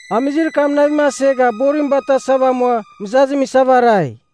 Amizir kam navim asegha borim batasava amua mɨzazim isava arai.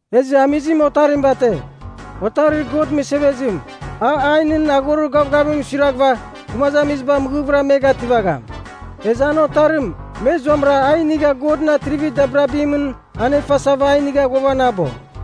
Ezɨ amizim otarim bate, otarir God mɨsevezim, a ainɨn aghorir gavgavimɨn suiraghɨva gumazamiziba mɨghɨvɨra me gativagham. Ezɨ an otarim me zuamɨra a inigha Godɨn atrivir dabirabimɨn anefasava a inigha ghuavanabo.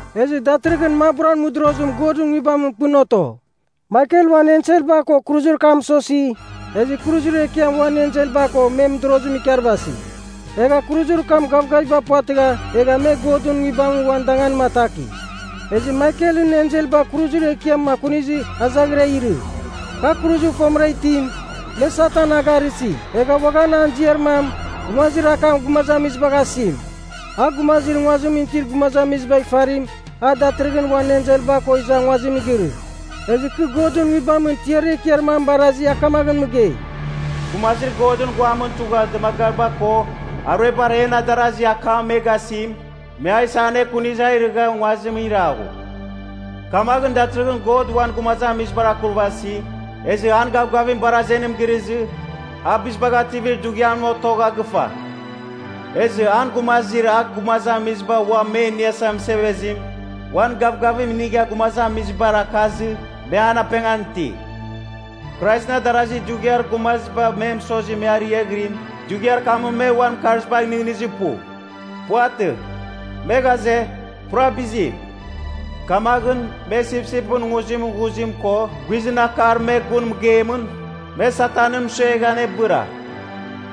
Ezɨ datɨrɨghɨn maburan mɨdorozim Godɨn Nguibamɨn pɨn oto. Maikel uan enselba ko kuruzir kam mɨsosi, ezɨ kuruzir ekiam uan enselba ko men mɨdorozim ikarvasi. Egha kuruzir kam gavgaviba puvatɨgha egha me Godɨn Nguibamɨn uan danganim ataki. Ezɨ Maikelɨn enselba kuruzir ekiam akunizɨ a izaghira irɨ. Kar kuruzir fomɨra itim, me Satan a garɨsi egha uaghan an ziar mam, “Gumazir Akam Gumazamizibagh asim.” A gumazir nguazimɨn itir gumazamizibagh ifarim, a datɨrɨghɨn uan enselba ko iza nguazim girɨ. Ezɨ kɨ Godɨn Nguibamɨn tiarir ekiar mam barazi a kamaghɨn mɨgei, “Gumazir Godɨn guamɨn tugha dɨmagariba ko aruebar en adarazi akam me gasim, me a isa anekunizɨ a irɨgha nguazimɨn iraghu. Kamaghɨn, datɨrɨghɨn God uan gumazamizibar akurvasi, ezɨ an gavgavim bar azenim girɨzɨ, A Bizibagh Ativir Dughiam otogha gɨfa! Ezɨ an Gumazir A Gumazamiziba Uam Me Iniasa Mɨsevezim, uan gavgavim inigha gumazamizibar akazɨ, me an apengan iti! Kraisɨn adarazi, dughiar gumaziba me mɨsozima me ariaghɨrim, dughiar kamɨn me uan mɨkarzibagh nɨghnɨzir pu. Puvatɨ. Me ghaze, pura bizim. Kamaghɨn, me sipsipɨn nguzimɨn ghuzim ko guizɨn akar me gun mɨgeimɨn, me Satanɨn mɨsuegha anebɨra.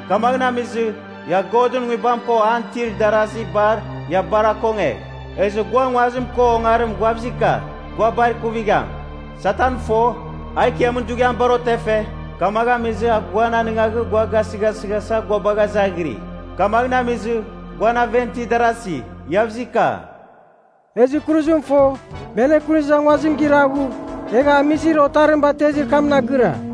Kamagh amizɨ, ia Godɨn Nguibam ko an itir darasi bar, ia bar akongegh! Ezɨ gua nguazim ko ongarim guavzika, gua bar ikuvigham. Satan fo, a ikiamin dughiam bar otefe, kamagh amizɨ a guan anɨngaghɨ gua gasɨghasɨghasa gua bagha izaghirɨ. Kamaghɨn amizɨ, guan aven itir darasi, Iavzika.” Ezɨ kuruzim fo, me anekunizɨ a nguazimɨn iraghu, egha amizir otarim batezir kamɨn agɨra.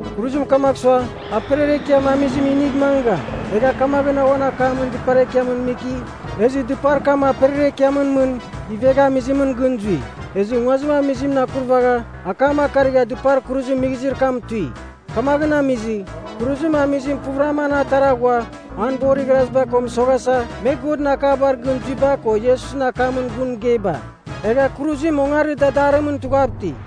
Kuruzim kamagh sua, aperiar ekiam amizim inigh mangɨgham. Egha kamaghɨn uan akamɨn dɨpar ekiamɨn miki, ezɨ dɨpar kam aperiar ekiamɨn mɨn ivegha amizimɨn gɨn zui. Ezɨ nguazim amizimɨn akurvagha, akam akarigha dɨpar kuruzim mighizir kam tui. Kamagh amizɨ, kuruzim amizim puvɨram an atara ghua an borir igharaziba ko mɨsoghasa, me Godɨn akabar gɨn zuiba ko Iesusɨn akamɨn gun mɨgeiba. Egha kuruzim ongarir dadarimɨn tughav iti.